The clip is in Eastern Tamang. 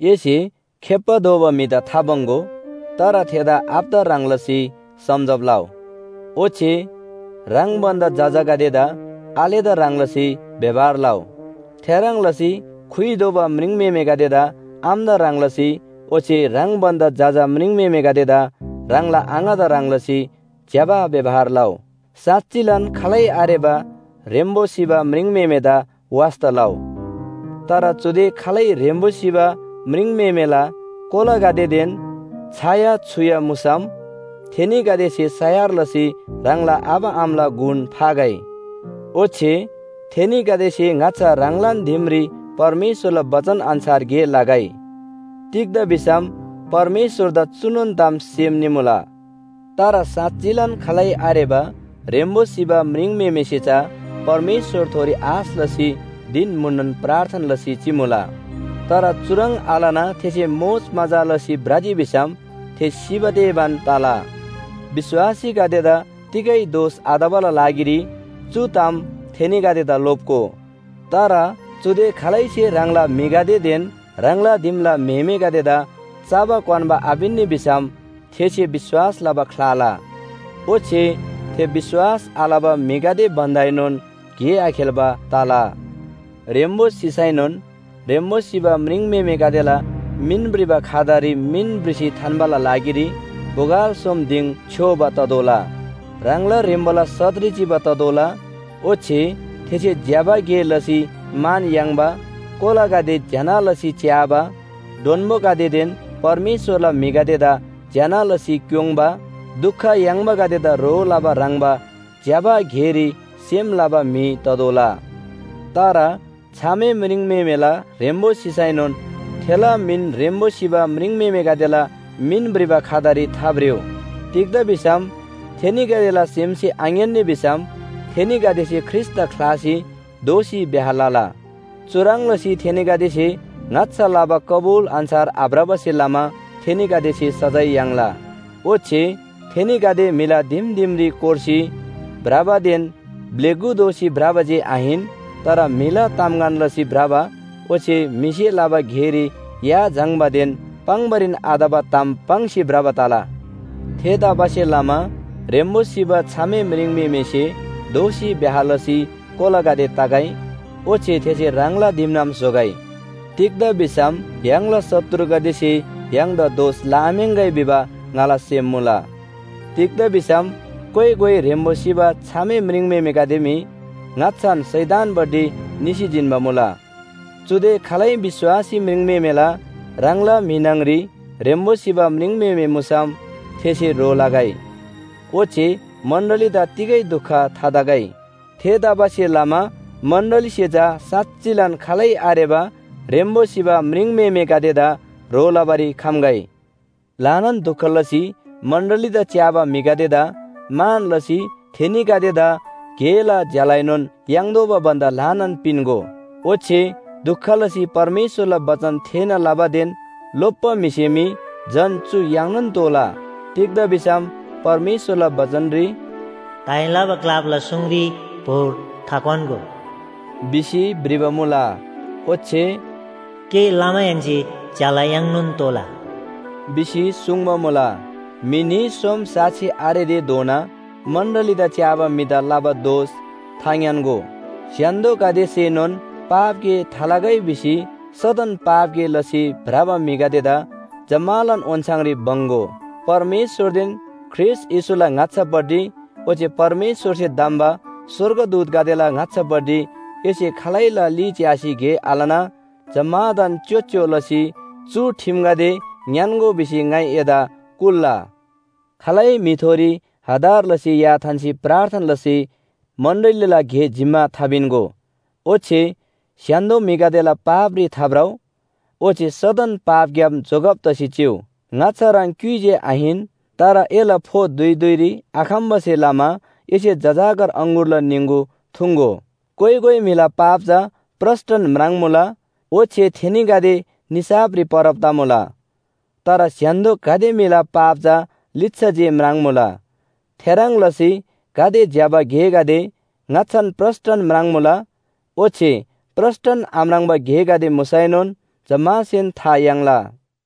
एसे खेप्‍बा दोबा म्‍हिदा थाबङ्‌गो, तर थेदा आबादा ह्रङ् लसी सम्‍झब लउ। ओच्‍छे ह्राङ भन्‍दा जजागदेदा आलेदा ह्रङ् लसी व्‍यवहार लउ। थेह्रङ् लसी खुइ दोबा म्रिङम्‍हेमेगदेदा आमादा ह्रङ् लसी ओच्‍छे ह्राङ भन्‍दा जजा म्रिङम्‍हेमेगदेदा ह्राङला आङादा ह्रङ् लसी ज्‍यबा व्‍यवहार लउ। साँच्‍चिलान, खालै आरेबा ह्रेम्‍बो सिबा म्रिङम्‍हेमेदा वास्‍ता लउ। तर चुदे खालै ह्रेम्‍बो सिबा म्रिङम्‍हेमेला कोलागदेदेन छाया छुया मुसम थेनीगदेसे सयार लसी ह्राङला आबा आमाला गुण फागै। ओच्‍छे थेनीगदेसे ङाच्‍छा ह्राङलान दिमरी परमेश्‍वरला बचन अन्‍छार गे लगै। तिग्‍दा भिसम परमेश्‍वरदा चुनोन ताम सेम निमुला। तर साँच्‍चिलान, खालै आरेबा ह्रेम्‍बो सिबा म्रिङम्‍हेमेसे चा परमेश्‍वरथोरी आश लसी धिन म्‍हुननोन प्रार्थना लसी चिमुला। तर चुह्रङ् आलना थेसे मोजमजा लसी भ्रजी भिसम थे सिबा तेबान तला। विश्‍वासीगदेदा तिगै दोष आतबाला लागिरी चु ताम थेनीगदेदा लोप्‍गो। तर चुदे खालैसे ह्राङला म्‍हिगदेदेन ह्राङला दिमला म्‍हेमेगदेदा चबा क्‍वान्‍बा आपिन्‍नी भिसम थेसे विश्‍वास लबा ख्‍लाला। ओच्‍छे थे विश्‍वास आलबा म्‍हिगदे भन्‍दाएनोन गे आखेल्‍बा तला। ह्रेम्‍बो सिसैनोन ह्रेम्‍बो सिबा म्रिङम्‍हेमेगदेला मिन भ्रिबा खातारी मिन भ्रिसी थान्‍बाला लागिरी बोगल सोम दिङ छ्‌योबा ततोःला, ह्राङला ह्रेम्‍बोला सतरी चिबा ततोःला, ओच्‍छे थेसे ज्‍यबा गे लसी मान याङ्बा, कोलागदे ज्‍यना लसी च्‍याबा, डोन्‍बोगदेदेन परमेश्‍वरला म्‍हिगदेदा ज्‍यना लसी क्‍योङ्बा, दुख याङ्बागदेदा ह्रो लबा ह्रङ्‌बा ज्‍यबा गेरी सेम लबा म्‍हि ततोःला। तर छामे म्रिङम्‍हेमेला ह्रेम्‍बो सिसैनोन थेला मिन ह्रेम्‍बो सिबा म्रिङम्‍हेमेगदेला मिन भ्रिबा खातारी थाभ्रिउ। तिग्‍दा भिसम थेनीगदेला सेमसे आङ्‌यान्‍नी भिसम थेनीगदेसे ख्रीष्‍टदा ख्‍लासी दोःसी ब्‍याह लला। चुह्रङ् लसी थेनीगदेसे ङाच्‍छा लबा कबुल अन्‍छार आभ्रबासे लमा थेनीगदेसे सजाय याङ्ला। ओच्‍छे थेनीगदे म्‍हिला दिम दिमरी कोर्सी भ्रबादेन ब्‍लेगु दोसी भ्रबा जे आहिन, तर म्‍हिला तामगन लसी भ्रबा ओच्‍छे म्‍हिसे लबा गेरी या झाङ्‌बादेन पाङ्‌बारीन आतबा ताम पाङ्सी भ्रबा तला। थेतबासेलमा ह्रेम्‍बो सिबा छामे म्रिङम्‍हेमेसे दोःसी ब्‍याह लसी कोलागदे तगै ओच्‍छे थेसे ह्राङला दिमनाम स्‍होगै। तिग्‍दा भिसम य्‍हाङला शत्रुगदेसे य्‍हाङदा दोष लआम्‍याङ्‍गै भिबा ङाला सेम मुला। तिग्‍दा भिसम कोइ कोइ ह्रेम्‍बो सिबा छामे म्रिङम्‍हेमेगदे मी ङाच्‍छान शैतानपट्टि निसी जिन्‍बा मुला। चुदे खालै विश्‍वासी म्रिङम्‍हेमेला ह्राङला म्‍हि न्‍हङरी ह्रेम्‍बो सिबा म्रिङम्‍हेमे मुसम थेसे ह्रो लगै, ओच्‍छे मण्‍डलीदा तिगै दुख थातगै। थेतबासेलमा मण्‍डलीसे चा साँच्‍चिन खालै आरेबा ह्रेम्‍बो सिबा म्रिङम्‍हेमेगदेदा ह्रो लबारी खम्‍गै। ल्‍हानान दुख लसी मण्‍डलीदा च्‍याबा म्‍हिगदेदा मान लसी थेनीगदेदा गेला ज्‍यालाएनोन याङ्तोःबा भन्‍दा ल्‍हानान पिन्‍गो, ओच्‍छे दुख लसी परमेश्‍वरला बचन थेःना लबादेन लोप्‍बा म्‍हिसे मी झन चु याङ्नोन तोःला। तिग्‍दा भिसम परमेश्‍वरला बचनरी “दाइँ लबा ग्‍लापला सुङरी भोर थाक्‍वान्‍गो” भिसी भ्रिबा मुला। ओच्‍छे “गे लमाहेन्‍से ज्‍याला याङ्नोन तोःला” भिसी सुङ्बा मुला। म्‍हि न्‍ही सोम साक्षी आरेतेधोना मण्‍डलीदा च्‍याबा म्‍हिदा लबा दोष थाङ्‌यान्‍गो। स्‍य्‍हान्‍दोगदेसेनोन पाप गे थालगै भिसी सदन पाप गे लसी भ्रबा म्‍हिगदेदा जम्‍मालान ओन्‍छाङरी बङ्‍‌गो। परमेश्‍वरदेन ख्रीष्‍ट येशूला ङाच्‍छापट्टि ओच्‍छे परमेश्‍वरसे धम्‍बा स्‍वर्गदूतगदेला ङाच्‍छापट्टि एसे खालैला ली च्‍यासी गे आलना जम्‍मादान च्‍योच्‍यो लसी चु ठिमगदे ङ्‌यान्‍गो भिसी ङाइ एदा कुल्‍ला। खालै म्‍हिथोरी हतार लसी या थान्‍सी प्रार्थना लसी मण्‍डलीला गे जिम्‍मा थापिन्‍गो। ओच्‍छे स्‍य्‍हान्‍दो म्‍हिगदेला पापरी थाभ्रउ। ओच्‍छे सदन पापग्‍याम जोगब तसी चिउ। ङाच्‍छा ह्रङ् क्‍युइ जे आहिन, तर एला फो धुइ धुइरी आखम्‍बासे लमा एसे जजाकर अङगुरला निङगु थुङ्‍गो। कोइ कोइ म्‍हिला पाप चा प्रस्‍टन म्राङ्‌मुला ओच्‍छे थेनीगदे निसाफरी परब तमुला। तर स्‍य्‍हान्‍दो गाते म्‍हिला पाप चा लिच्‍छा जे म्राङ्‌मुला। थेह्रङ् लसी गाते ज्‍यबा गेगदे ङाच्‍छान प्रस्‍टन म्राङ्‌मुला ओच्‍छे प्रस्‍टन आम्राङ्बा गेगदे मुसैनोन जम्‍मासेन था याङ्ला।